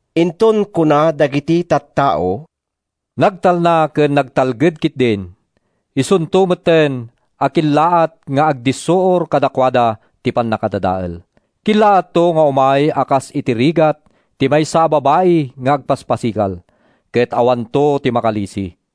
Inton kuna dagiti tattao, “Nagtalna ken nagtalged ketdin,” isunto metten a kellaat nga agdissuor kadakuada ti pannakadadael. Kellaatto nga umay a kas iti rigat ti maysa a babai nga agpaspasikal. Ket awanto ti makalisi.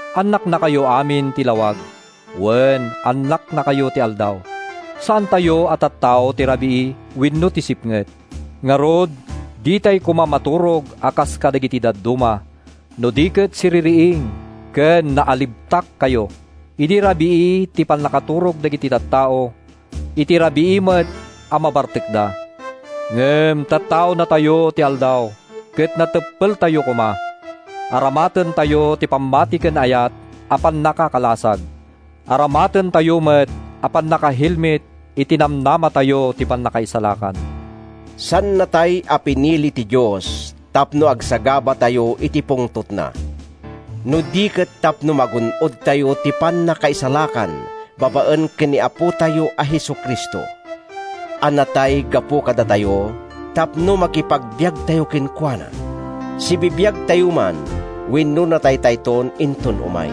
Annaknakayo amin ti lawag; wen, annaknakayo ti aldaw. Saantayo a tattao ti rabii wenno ti sipnget. Ngarud, ditay koma maturog a kas kadagiti dadduma, no di ket siririing ken naalibtakkayo. Iti rabii ti pannaturog dagiti tattao. Iti rabii met a mabartekda. Ngem tattaonatayo ti aldaw, ket nateppeltayo koma. Aramatentayo ti pammati ken ayat a pannakakalasag. Aramatentayo met a pannakahelmet ti namnamatayo iti pannakaisalakan. Saannatay a pinili ti Dios tapno agsagabatayo iti pungtotna, no di ket tapno magun-odtayo ti pannakaisalakan babaen ken ni Apotayo a Jesu-Cristo a natay gapu kadatayo tapno makipagbiagtayo kenkuana, sibibiagtayo man wenno nataytayton inton umay.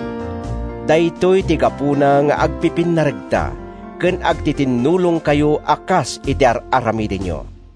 Daytoy ti gapuna nga agpipinnaregta ken agtitinnulongkayo a kas iti ar-aramidenyo.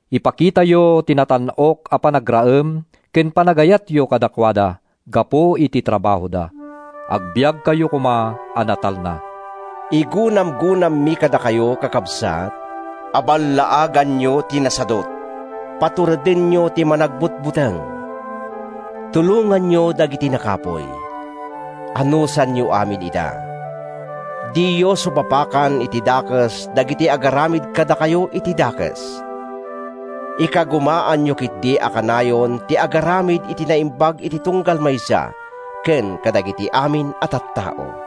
Ipakitayo ti natan-ok a panagraem ken panagayatyo kadakuada gapu iti trabahoda. Agbiagkayo koma a natalna. Igunamgunammi kadakayo, kakabsat, a ballaaganyo ti nasadut. Paturedenyo ti managbutbuteng. Tulonganyo dagiti nakapuy. Anusanyo amin ida. Diyo supapakan iti dakes dagiti agaramid kadakayo iti dakes. Ikagumaanyo ketdi a kanayon ti agaramid iti naimbag iti tunggal maysa ken kadagiti amin a tattao.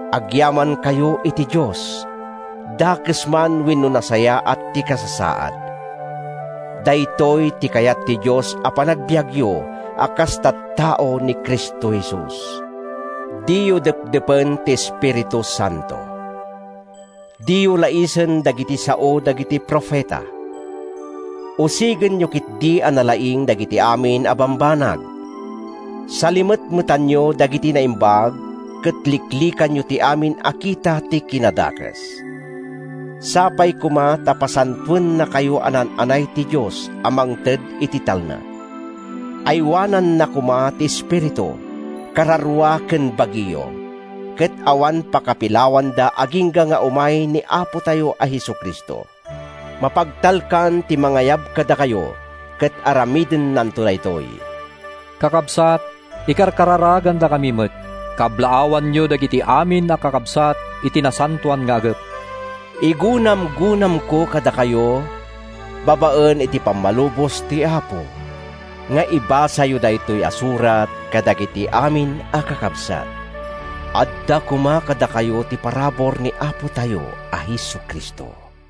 Agyamankayo iti Dios, dakes man wenno nasayaat ti kasasaad. Daytoy ti kayat ti Dios a panagbiagyo a kas tattao ni Cristo Jesus. Diyo depdepen ti Espiritu Santo. Diyo laisen dagiti sao dagiti profeta. Usigenyo ketdi a nalaing dagiti amin a bambanag. Salimetmetanyo dagiti naimbag ket liklikanyo ti amin a kita ti kinadakes. Sapay koma ta pasantoennakayo a naan-anay ti Dios a mangted iti talna. Aywananna koma ti espiritu, kararua ken bagiyo, ket awan pakapilawanda agingga nga umay ni Apotayo a Jesu-Cristo. Mapagtalkan ti mangayab kadakayo ket aramidennanto daytoy. Kakabsat, ikarkararagandakami met. Kablaawanyo dagiti amin a kakabsat iti nasantoan nga agek. Igunamgunamko kadakayo, babaen iti pammalubos ti Apo, nga ibasayo daytoy a surat kadagiti amin a kakabsat. Adda koma kadakayo ti parabur ni Apotayo a Jesu-Cristo.